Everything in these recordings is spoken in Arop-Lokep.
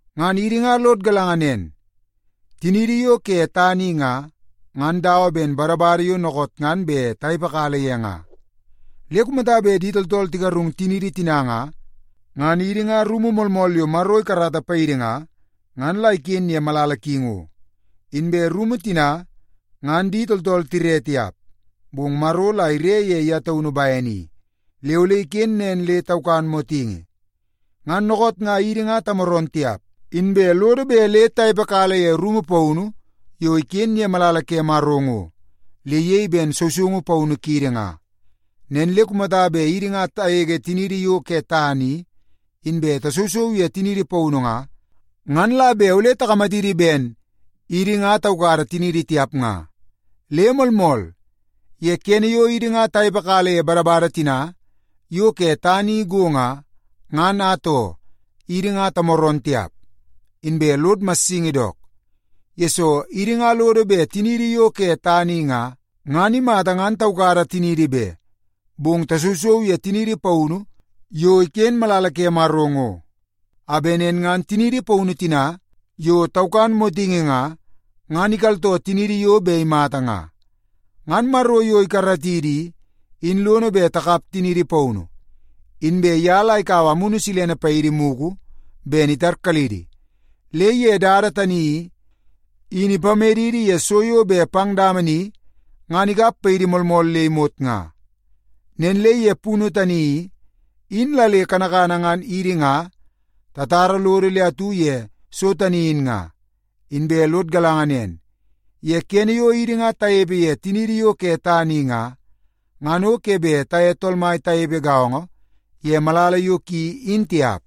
Ngan idi nga lod galanga nen, tiniidi yo ke tana i nga, ngan dawa ben badabada yo dookoot ngan bet tanepekala ye nga. Le kumata bet di tooltool tigarung tiniidi tina nga, ngan idi nga rumu moolmool yo Maro ikarata paidi nga, ngan la iken ye malala ki ngo. Inbe rumu tina, ngan di tooltool tire tiap, bong Maro la ire ye ye taunu bene i, le ole iken nen le taukan motingi. Ngan dookoot nga idi nga tamooroon tiap, inbe lodo bet le tanepekala ye rumu paunu yo iken ye malala ke Maro ngo, le iyei ben sousoungu paunu kiidi nga. Nen le kumata bet idi nga tagege tiniidi yo ke tana i, inbe tasousou ye tiniidi paunu nga, ngan la bet ole takamatidi ben idi nga taukada tiniidi tiap nga. Le moolmool, ye kene yo idi nga tanepekala ye badabada tina yo ke tana i go nga, ngan atoo, idi nga tamooroon tiap, inbe lod massingi dook. Yesoo, idi nga lodo bet tiniidi yo ke tana i nga, ngan imata ngan taukada tiniidi be, bong tasousou ye tiniidi paunu yo iken ye malala ke Maro ngo, a bet nen ngan tiniidi paunu tina yo taukan motingi nga, ngan ikaltoo tiniidi yo bet imata nga. Ngan Maro yo ikaratidi i, in lono bet takap tiniidi paunu. Inbe ye la ikaua Amunu Silene paidi mugu ben itarkalidi, le ye dada tani i, in ipamedidi ye so yo bet pang dama ni ngan ikap paidi moolmool le imot nga. Nen le ye punu tani i, in la le kanakana ngan idi nga tatara lodo le atu ye so tani in nga. Inbe lod galanga nen, ye kene yo idi nga tanepe ye tiniidi yo ke tana i nga, ngan o ke bet taye Tool Mai tanepe gaongo ye malala yo ki in tiap.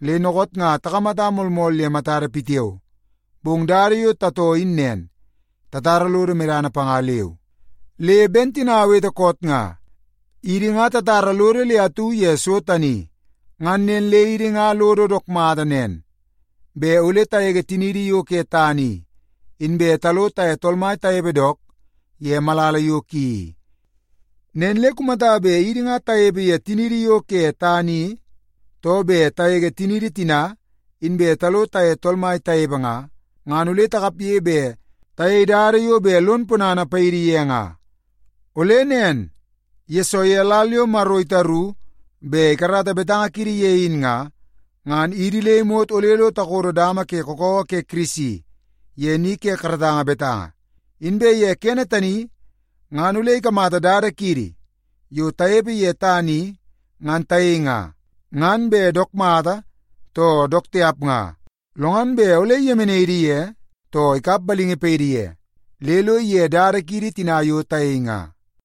Le dookoot nga takamata moolmool ye matada pitiao, bong dada yo tatoo in nen, tatara lodo medana panga leu. Le ben tina awete koot nga, idi nga tatara lodo le atu ye so tani. Ngan nen le idi nga lodo dook mata nen bet ole tagege tiniidi yo ke tana i, inbe talo taye Tool Mai tanepe dook ye malala yo ki i. Nen le kumata bet idi nga tanepe ye tiniidi yo ke tana i, too bet tagege tiniidi tina inbe talo taye Tool Mai tanepe nga, ngan ole takapge bet tayei dada yo bet lon ponana paidi ye nga. Ole nen, yesoo ye lal yo Maro itaru bet ikarata betanga kiidi ye in nga, ngan idi le imot ole lo takodo dama ke kakawa ke Kirisi ye ni ke karatanga betanga. Inbe ye kene tani ngan ole ikamata dada kiidi yo tanepe ye tana i ngan tayei nga, ngan bet dook mata too dook tiap nga. Lo ngan bet ole iyemenai idi ye, too ikap balingi paidi ye, le lo ige dada kiidi tina yo tayei nga.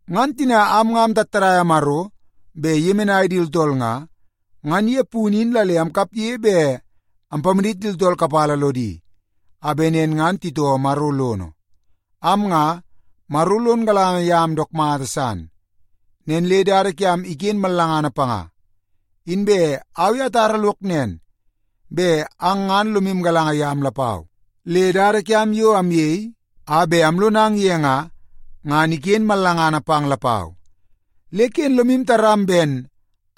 Ngan tina am nga amtattadaia Maro bet iyemenai di tooltool nga, ngan ye punu in la le amkapge bet ampamadit di tooltool kapala lodi a bet nen ngan titoo Maro lono. Am nga, Maro lon galanga yam dook mata san, nen le dada kiam iken mallangana panga. Inbe au i atara lok nen bet ang ngan lomu galanga yam lapau, le dada kiam yo amyei a bet amlonang ye nga, ngan iken mallangana pang lapau. Le ken lomu taram ben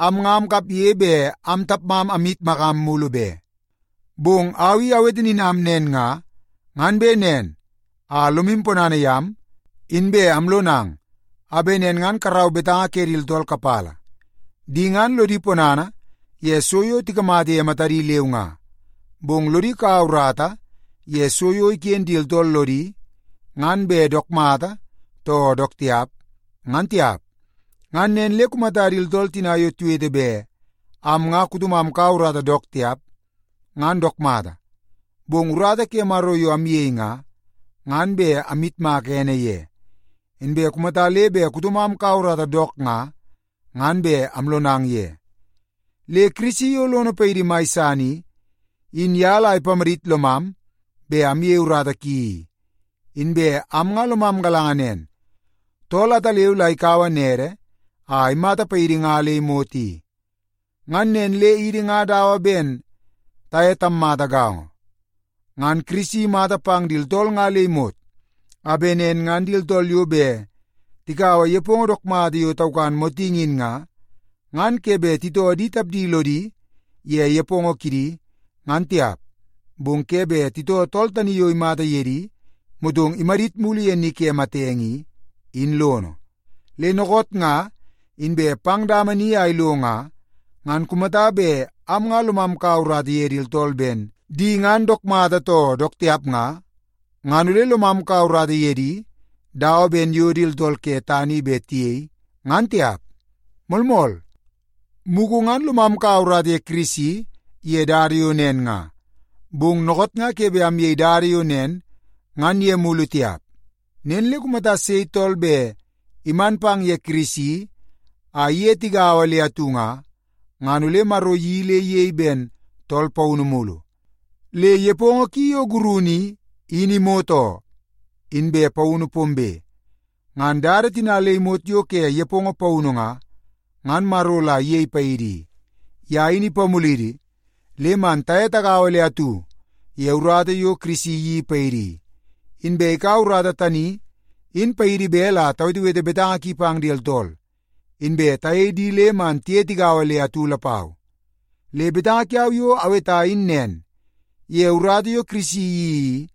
am nga amkapge bet am tapmam amyitmakam mulu be. Bong au i awete nin am nen nga, ngan bet nen a lomu ponana yam, inbe alonang a bet nen ngan karau betanga ke di tooltool kapala. Di ngan lodi ponana ye so yo tikamata ye matadi leu nga, bong lodi kaua urata ye so yo iken di tooltool lodi, ngan bet dook mata too dook tiap, ngan tiap. Ngan nen le kumata di tooltool tina yo tiwete bet am nga kutomam kaua urata dook tiap, ngan dook mata. Bong urata ke Maro yo amyei nga, ngan bet amyitmaka ene ye. Inbe kumata le bet kutomam kaua urata dook nga, ngan bet amlonang ye. Le Kirisi yo lono paidi mai san i, in ye la ipamadit lomam bet amyei urata ki i. Inbe am nga lomam galanga nen, tool ataleu la ikaua nede a imata paidi nga le imot i. Ngan nen le idi nga dawa ben taye tammata gaongo. Ngan Kirisi imata pang di tooltool nga le imot, a bet nen ngan di tooltool yo bet tikaua nepongo dook mata yo taukan motingi in nga, ngan ke bet titoo di tapdi lodi ye nepongo kidi, ngan tiap, bong ke bet titoo tool tani yo imata ye di, motong imadit mulu ye ni ke matenge i, in lono. Le dookoot nga inbe pang dama ni a ilo nga, ngan kumata bet am nga lomam kaua urata ye di tooltool ben di ngan dook mata too dook tiap nga, ngan ole lomam kaua urata ye di dawa ben yo di tooltool ke tana i bet tiyei, ngan tiap. Moolmool, mugu ngan lomam kaua urata ye Kirisi ye dada yo nen nga, bong dookoot nga ke bet amyei dada yo nen ngan ye mulu tiap. Nen le kumata sei tool bet iman pang ye Kirisi a iye tigaua le atu nga, ngan ole Maro iyeii le iyei ben tool paunu mulu. Le nepongo ki yo gurunu i, in imot oo, inbe paunu pombe. Ngan dada tina le imot yo ke nepongo paunu nga, ngan Maro la iyei paidi i. Ye in ipamulidi le man taye tagaua le atu ye urata yo Kirisi iyeii paidi i, inbe ikaua urata tani in paidi bet la tawetewete betanga ki pang di tooltool, inbe tayei di le man tiye tigaua le atu lapau. Le betanga kiau yo aweta in nen, ye urata yo Kirisi iyeii i,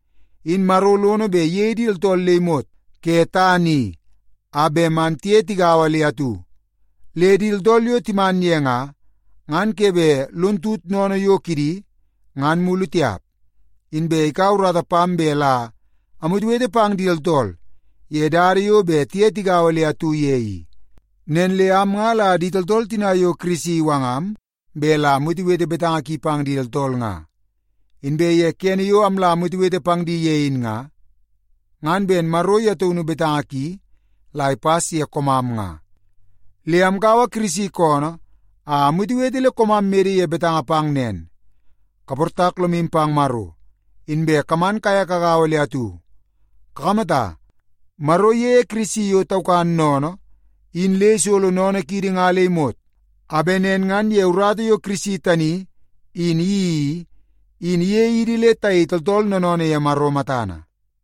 in Maro lono bet iyei di tooltool le imot ke tana i a bet man tiye tagaua le atu. Le di tooltool yo timan ye nga, ngan ke bet lon tut sennene yo kidi ngan mulu tiap. Inbe ikaua urata pam bet la amwetewete pang di tooltool ye dada yo bet tiye tigaua le atu ye i. Nen le am nga la di tooltool tina yo Kirisi iwangam bet la amwetewete betanga ki pang di tooltool nga. Inbe ye kene yo amla amwetewete pang di ye in nga, ngan ben Maro ye taunu betanga ki la ipas ye koomam nga. Le amkaua Kirisi koonoo a amwetewete le koomam mede ye betanga pang nen, kaportak lomu pang Maro, inbe kaman kaye kagaua le atu. Kakamata, Maro iyeie Kirisi yo taukan sennene i, in le isolo sennene kiidi nga le imot, a bet nen ngan ye urata yo Kirisi tani in iyeii i, in iyei idi le tayei tooltool noonoonoo ye Maro matana.